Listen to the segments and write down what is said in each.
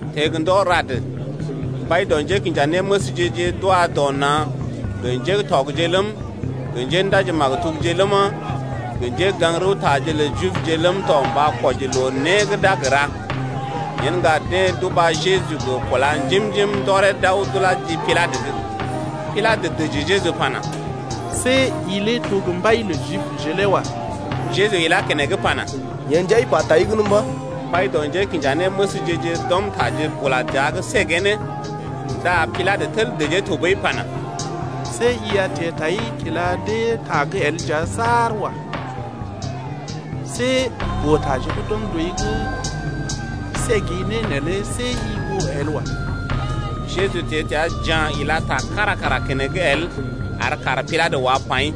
Teḛ gə ndɔ rad, mbai dɔ njékinjanéməsje-je d’wa dɔ na̰ gə njé gə́ tɔgje ləm, gə njéndaji-maktubje ləma, gə njégaŋ-rəwtaje lə Jibje ləm tɔ mba kwɔji loo né gə́ d’a gə ra. Yen ŋga deḛ d’uba Jeju gə kúla njim-njim ndɔree d’aw d’ulá ji Pilatə’g. Pilatə dəji Jeju pana: See i lé to gə́ mbai lə Jibje lé wa. Jeju ila dee keneŋ pana: Yee nja i pa tai gən mba̰. Mbai dɔ njékinjanéməsje-je d’ɔm taje bula dəa’g səgee ne. Ndá Pilatə tel dəjee tɔɓəi pana: See i a teḛ tai kila dee ta’g el nja saar wa. See boo-taje gə́ d’ɔm dɔi’g səgi ne neelé see i oo el wa. Jeju teḛ təa ja̰ ila ta kára kara keneŋ el ar kaar Pilatə lé wá paḭ.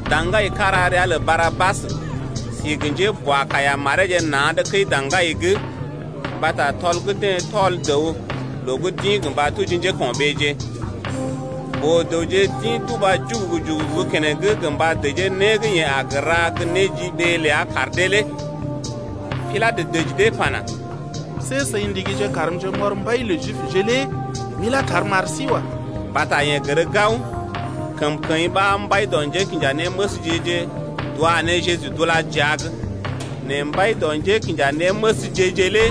Da̰gai kára ria lə Barabas si gə njéboakaiya mareeje na̰’d kəi-daŋgai’g mbata tɔl gə́ deḛ tɔl dəw loo gə́ d’ḭ gə mba tuji njéko̰ɓeeje. Boo-dəwje d’ḭ d’uba jugugu-jugugu gə keneŋ gə mba dəjee né gə́ yeḛ aw ra ta-ta ar dee lé. Pilatə dəji dee pana: See seḭ ndigije karmje m’ɔr mbai lə Jibje lé m’ilá tar m’ar sí wa. Mbata yeḛ gər gao, kəmkəḭ ɓa mbai dɔ njékinjanéməsje-je d’wa ne Jeju d’ulá ne jia’g. Nɛ Mbai dɔ njékinjanéməsje-je lé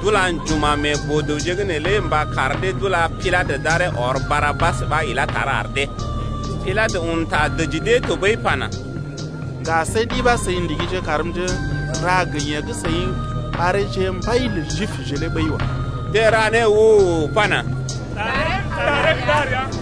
d’ula njuma̰ mee boo-dəwje’g neelé mba kar dee d’ula Pilatə d’aree ɔr Barabas ɓa ilá tar ar dee. Pilatə un ta dəji dee tɔɓəi pana: Ŋga see ɗi ɓa seḭ ndigije karmje m’ra gə yeḛ gə́ seḭ ɓareeje mbai lə Jibje lé ɓəi wa. Deḛ ra né u-u-u pana: Ɗaree gə́ ɗar ya.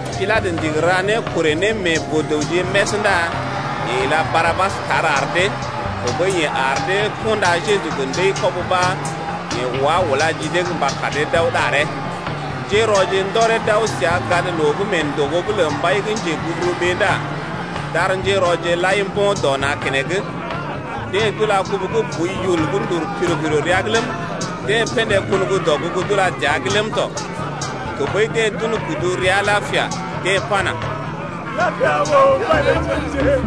Pilatə ndigi kar rɔ boo-dəwje lé lel dee dəa’g ndá yeḛ ila Barabas tar ar dee, tɔɓəi yeḛ ar dee kunda Jeju gə ndəi-kɔb ɓa yeḛ wá ulá ji dee’g gə mba kar dee d’aw ɗaree. Njérɔje ndɔree d’aw səa gadloo gə́ mee ndògo’g lə mbai gə́ njeguburuɓee ndá d’ar njérɔje lai mbo̰ dɔ na̰ keneŋ. Deḛ d’ula kubu gə́ boi yul gə́ ndul piro-piro rəa’g ləm, deḛ pḛdé kun gə́ dɔgugu d’ulá dəa’g ləm tɔ. Tɔɓəi deḛ d’un kudu rəa lapia pa ne pana: Lapia ɓòo, mbai lə Jibje!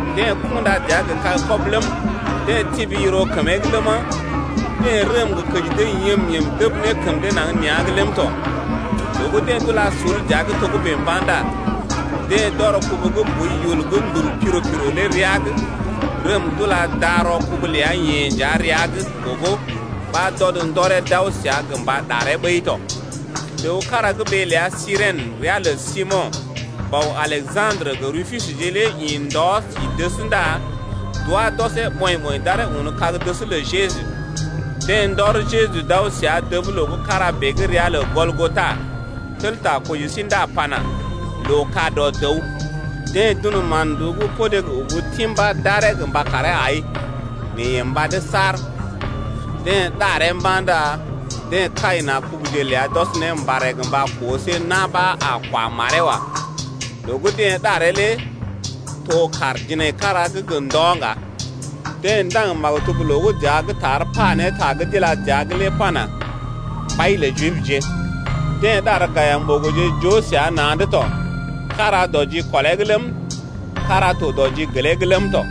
Deḛ kunda dəa gə kag-kɔbə ləm, deḛ tibi yiro kəmee’g ləma, deḛ rəm gə kəji dee yəm-yəm dəb ne kəm dee naŋg nea̰’g ləm tɔ. Loo gə́ deḛ d’ula sul dəa’g togə́bè mba̰ ndá deḛ d’ɔr kubu gə́ boi yul gə́ ndul piro-piro lé rəa’g, rəm d’ula darɔ kubu ləa-yeḛ nja rəa’g gogo, ɓa d’ɔd ndɔree d’aw səa gə mba ɗaree ɓəi tɔ. Dəw kára gə́ ɓee ləa Sirèn, ria lə Simo̰, bɔ Aleja̰drə gə Rupusje lé ḭ ndɔ si dəs ndá d’wá d’ɔsee ɓɔḭ-ɓɔḭ d’aree un kag-dəs lə Jeju. Deḛ ndɔr Jeju d’aw səa dəb loo gə́ kára bèe gə́ ria lə Gɔlgota, tel ta koji sí ndá pana: Loo-ka-dɔ-dəw. Deḛ d’un mán-nduú podé gə ubu timbá d’aree gə mba karee ai nɛ yeḛ mbad saar. Deḛ ɗaree mba̰ ndá deḛ kai na̰ kubuje ləa d’ɔs ne mbarè gə mba koo see na̰ ɓa a kwa maree wa. Loo gə́ deḛ ɗaree lé to kàr jinaikara gə́ gə ndɔ ŋga. Deḛ ndaŋg maktub loo gə́ dəa’g tar pa ne ta gə́ d’ila dəa’g lé pana: Mbai lə Jibje! Deḛ ɗar gayim-ɓogoje joo na̰’d səa tɔ, kára dɔ jikɔlee’g ləm, kára dɔ jigelee’g ləm tɔ.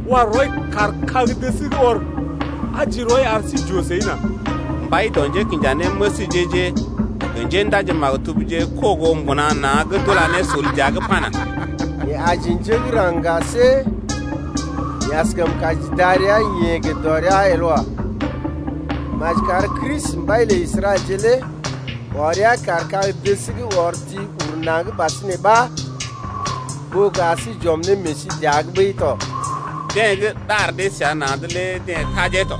wa rɔi kaar kag-dəs’g ɔr, aji rɔi ar sí j’oo səi nà. Mbai dɔ njékinjanéməsje-je gə njéndaji-maktubje kogo mbuna na̰’d d’ula ne sul dəa’g pana: Yeḛ aji njé gə́ raŋg ŋga see yeḛ askəm kaji darəa-yeḛ gə dɔrea el wa. Maji kar Kristi, mbai lə Israɛlje lé wa rəa kaar kag-dəs’g ɔr ti uru naŋg ɓasinè ɓa ɓó gə ar sí j’ɔm ne meḛ sí dəa’g ɓəi tɔ. Deḛ gə́ ɗar dee səa na̰’d lé deḛ tajee tɔ.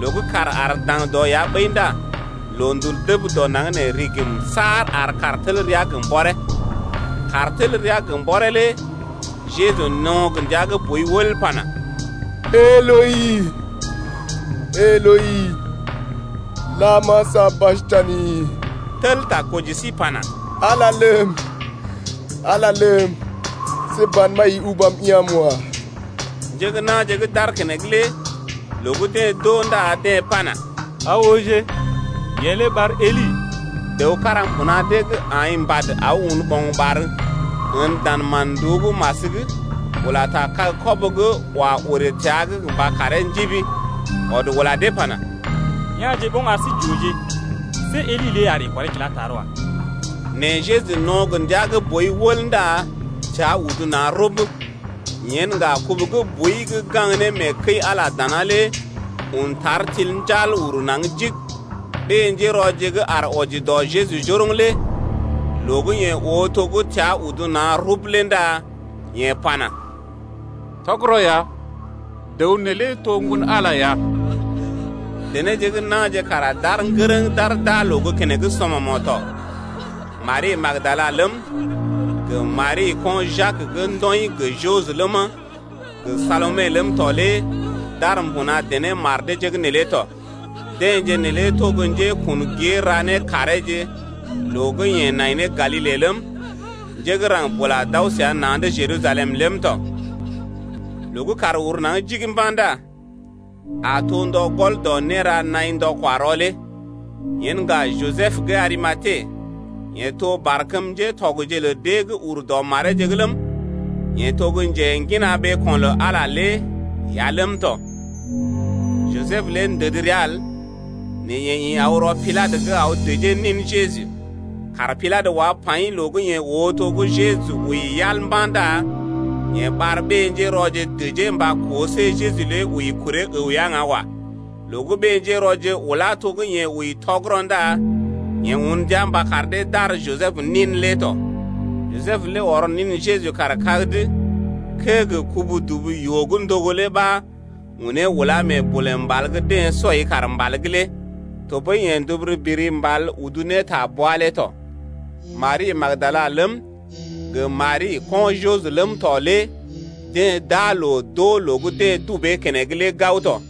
Loo gə́ kàr aar daŋdɔ ya ɓəi ndá loondul dəb dɔ naŋg nee rigim saar ar kàr tel ra gə mbɔree. Kàr tel rəa gə́ mbɔree lé Jeju no̰ gə ndia gə́ boi wəl pana: Eloi, Eloi, lama sabaktani, tel ta koji sí pana: Ala ləm, Ala ləm, see ban ɓa i ubam ya̰’m wa. Njé gə́ na̰je gə́ d’aar keneŋ lé loo gə́ deḛ d’oo ndá deḛ pana: Aa ooje, yeḛ lé ɓar Eli. Dəw kára mbuna dee’g aḭ mbad aw un ɓo̰gɓar ən dan mán-nduú gə́ mas’g, ula ta kag-kɔbə’g, wa woree təa’g gə mba karee njibi, ɔd ula dee pana: Ya̰je ɓoŋ ar sí j’ooje, see Eli lé a ree kɔree kilá tar wa. Nɛ Jeju no̰ gə ndia gə́ boi wəl ndá təa udu na̰ rub. Yen ŋga kubu gə́ boi gə́ gaŋg ne mee kəi-Ala dana lé un tar til njal ur naŋg jig. Ɓé-njérɔje gə́ aar wɔji dɔ Jeju njoroŋ lé loo gə́ yeḛ oo to gə́ təa udu na̰ rub lé ndá yeḛ pana: Tɔgərɔ ya, dəw neelé to Ŋgon-Ala lé ya. Denéje gə́ na̰je kara d’aar ŋgərəŋ d’aar d’aa loo gə́ keneŋ sɔmɔmo̰ tɔ. Mari gə́ Magdala ləm, gə Mari, ko̰ Jak gə́ ndɔḭ gə Joses ləma, gə Salome ləm tɔ lé d’aar mbuna dené mar deeje’g neelé tɔ. Deḛje neelé to gə́ njékun gée ra né kareeje loo gə́ yeḛ nai ne Galile ləm, njé gə́ raŋg bula d’aw səa na̰’d Jerusalem ləm tɔ. Loo gə́ kàr uru naŋg jig mba̰ ndá a to ndɔ gɔl dɔ néra naḭ ndɔ-kwa-rɔ lé. Yen ŋga Jisəb gə́ Arimate, yeḛ to barkəm ŋgatɔgje lə deḛ gə́ ur dɔ mareeje’g ləm, yeḛ to gə́ njengina ɓeeko̰ lə Ala lé ya ləm tɔ. Jisəb lé ndəd rəa el nɛ yeḛ ḭ aw rɔ Pilatə’g aw dəjee nin Jeju. Kaar Pilatə wá paḭ loo gə́ yeḛ oo to gə́ Jeju wəi yal mba̰ ndá yeḛ ɓar ɓé-njérɔje dəjee mba koo see Jeju lé wəi kuree əw ya ŋga wa. Loo gə́ ɓé-njérɔje ulá to gə́ yeḛ wəi tɔgərɔ ndá yeḛ un ndia mba kar dee d’ar Jisəb nin lé tɔ. Jisəb lé ɔr nin Jeju kaar kag’d kəee gə kubu-dubu-yoo gə́ ndogo lé ɓa unee ulá mee bolè mbal gə́ deḛ sɔi kaar mbal’g lé. Tɔɓəi yeḛ nduburu biri mbal udu ne ta bwa lé tɔ. Mari gə́ Magdala ləm, gə Mari gə́ ko̰ Joses ləm tɔ lé deḛ d’aa loo d’oo loo gə́ deḛ dubee keneŋ lé gao tɔ.